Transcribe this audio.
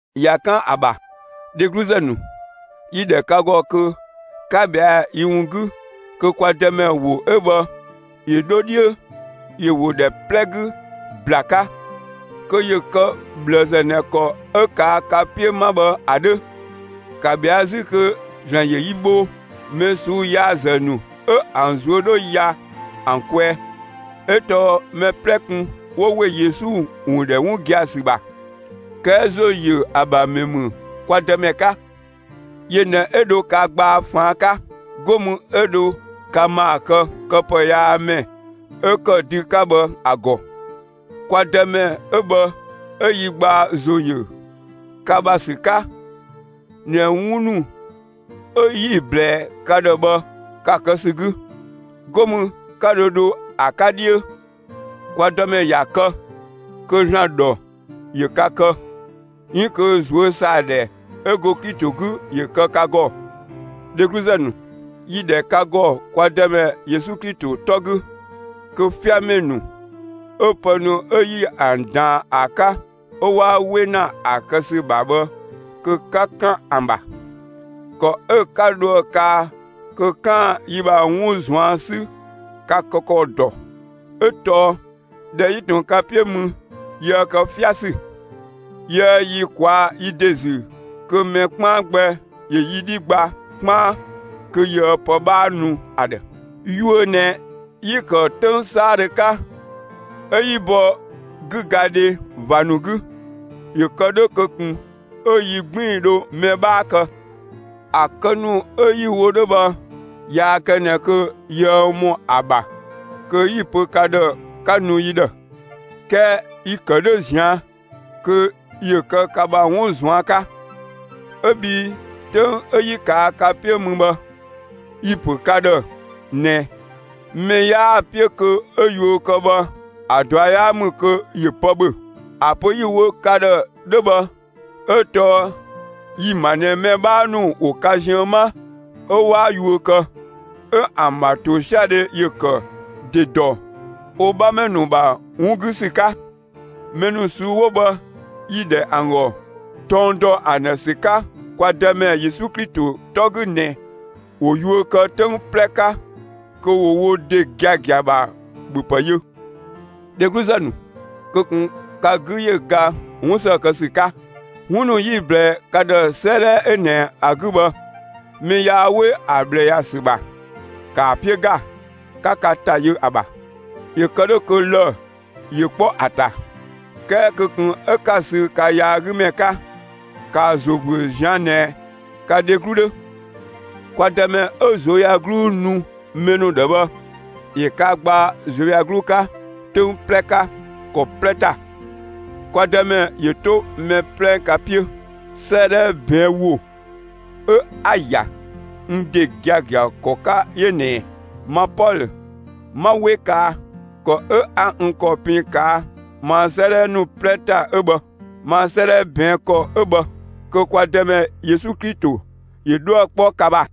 ꞊Ya 'kan ‑a ‑bha, dhegluzë ‑nu, yi‑ ‑dhɛ ka ‑gɔ kö 'ka ꞊bhɛa'‑ yi ‑wun 'gü kö kwa Dëmɛ ‑wo 'ö bhë ‑yö 'dho 'dhiö, ‑yö ‑wo ‑dhɛ 'plɛ 'gü ‑bla 'ka kö ‑yö kë ꞊bhlëzë ꞊nɛ ‑kɔ 'ö ꞊kaa' ka 'piö 'ma bhë ‑a 'dhö. ‑Ka ꞊bhɛa'‑ 'zü kö ‑Zlan ‑yö yi bho mɛ ꞊suu'‑ yaazë ‑nu 'ö ‑an ꞊zuö' 'dhö ya ‑an kwɛɛ. 'Ö tɔɔ mɛ 'plɛ kun 'wo ‑we Yesu ‑wun ‑dhɛ 'wun gia‑ ‑sü ‑bha. 'Kɛɛ ‑zo ‑yö ‑a ‑bha ‑mɛ ‑mü kwa Dëmɛ 'ka. Yö ꞊nɛ 'ö dho ka gbaa ꞊faan' 'ka. 'Go mü 'ö dho ka ‑maa kë këpëyaamɛ ('ö ‑kë dü 'ka bhë) ‑a ‑gɔ. Kwa Dëmɛ 'ö bhë 'ö yi gbaa ‑zo ‑yö ka ‑bha ‑sü 'ka ꞊nɛ 'wun ‑nu 'ö 'yi‑ ꞊blɛɛ ka ‑dhë bhë, ka‑ kë ‑sü 'gü. 'Go mü 'ka dho dho ‑a 'ka 'dhiö. Kwa Dëmɛ ‑ya kë kö ‑Zlan ‑dhɔ ‑yö ka kë, 'iin kö ꞊zuö' ‑saa ‑dhɛ 'ö go Klito 'gü ‑yö kë ka ‑gɔ! Dhegluzë ‑nu, 'yi‑ ‑dhɛ ka ‑gɔ kwa Dëmɛ Yesu Klito 'tɔ 'gü kö 'fiamɛ ‑nu 'ö pë ‑nu 'ö 'yi ‑an ‑daan ‑a 'ka 'ö 'waa 'we ‑na ‑a kë ‑sü ‑bha bhë kö 'ka 'kan ‑an ‑bha! ‑Kɔ 'ö 'ka dhoë‑ kaa kö 'kaan‑ yi ‑bha 'wun ꞊zuan' 'sü, ka‑ kë ‑kɔ ‑dɔ; 'ö tɔɔ ꞊dhɛ 'yi tun ka 'piö mü yiëë kë 'fiasü. Yiëë yi ꞊kwaa' yi ‑de ‑zü kö mɛ 'kpaan gbɛ ‑yö yi 'dhi gba 'kpaan kö yiëë pë 'bhaa nu ‑a ‑dhë. Yuö ꞊nɛ 'yi‑ ‑kë 'töng 'saadhö 'ka, 'ö 'yi bɔ 'gügadhe ꞊va ‑nu 'gü. ‑Yö ‑kë 'dhö kö ꞊kun 'ö yi 'gbiin‑ dho mɛ 'bhaa kë. ‑A kë ‑nu 'ö 'yi‑ wo 'dhö bhë yaa kë ꞊nɛ kö yiëë ‑mɔ ‑a ‑bha kö 'yi‑ pö ka ‑dhë 'ka nu yi ‑dhë; 'kɛɛ yi‑ kë 'dhö ꞊zian' kö ‑yö kë ka ‑bha 'wun ꞊zuan' 'ka. 'Ö bhii 'töng 'ö 'yi ꞊kaa' ka 'piö mü bhë, yi‑ ‑pö ka ‑dhë ꞊nɛ mɛ 'yaa‑ 'piö kö 'ö yuö kë bhë ‑a ꞊dua' 'yaa ‑mü kö ‑yö pë ‑bhö. ‑A pö 'yi‑ wo ka ‑dhë 'dhö bhë 'ö tɔɔ yi‑ ‑ma ꞊nɛ mɛ 'bhaa ‑nu ‑wo ka ziën 'ma 'ö 'waa yuö kë; 'ö ‑an ‑bha ‑tosiadhe ‑yö ‑kë ‑de ‑dɔ wo 'bhamɛ ‑nu ‑bha 'wun 'gü ‑sü 'ka. Mɛ ‑nu ꞊suu'‑ 'wo bhë, yi‑ ‑dhɛ ‑an ‑gɔ tɔng ‑dɔ ‑an ‑dhë ‑sü 'ka kwa Dëmɛ Yesu Klito 'tɔ 'gü ꞊nɛ ‑wo yuö kë 'töng 'plɛ 'ka kö ‑wo wo ‑de giagia ‑bha ‑bhö ‑pë yö. Dhegluzë ‑nu, kö ꞊kun ka 'gü ‑yö ga 'wun ‑së kë ‑sü 'ka! 'Wun ‑nu 'yi‑ ꞊blɛɛ ka ‑dhë 'sëëdhɛ 'ö ꞊nɛ ‑a 'gü bhë mɛ yaa 'we ‑a ꞊bhlë ‑ya ‑sü ‑bha, ‑kaa 'piö ‑ga, 'ka ka ‑ta yö ‑a ‑bha, ‑yö kë 'dhö kö lë‑ ‑yö 'kpɔ ‑a ‑ta. 'Kɛɛ kö ꞊kun 'ö 'ka‑ sü ka yaagümɛ 'ka! ‑Ka ‑a ‑zo ‑büö ꞊zian' ꞊nɛ ka dheglu 'dhö. Kwa Dëmɛ 'ö ꞊zuöyagluu nu mɛ ‑nu ‑dhë bhë, ‑yö ka gbaa ꞊zuöyagluu 'ka, 'töng 'plɛ 'ka, ‑kɔ 'plɛ ‑ta! Kwa Dëmɛ ‑yö 'to mɛ 'plɛ ka 'piö! 'Sëëdhɛ ꞊bɛɛn' ‑wo 'ö 'a‑ ‑ya n ‑de giagia ‑kɔ 'ka 'yö ꞊nɛɛ: Ma Pɔlö, 'ma 'we kaa! ‑Kɔ 'ö 'a n ‑kɔ pin ꞊kaa' ma 'sëëdhɛ ‑nu 'plɛ ‑ta 'ö bhë. Ma 'sëëdhɛ ꞊bɛɛn' ‑kɔ 'ö bhë. Kö kwa Dëmɛ Yesu Klito ‑yö 'dhuë‑ 'kpɔ ka ‑bha!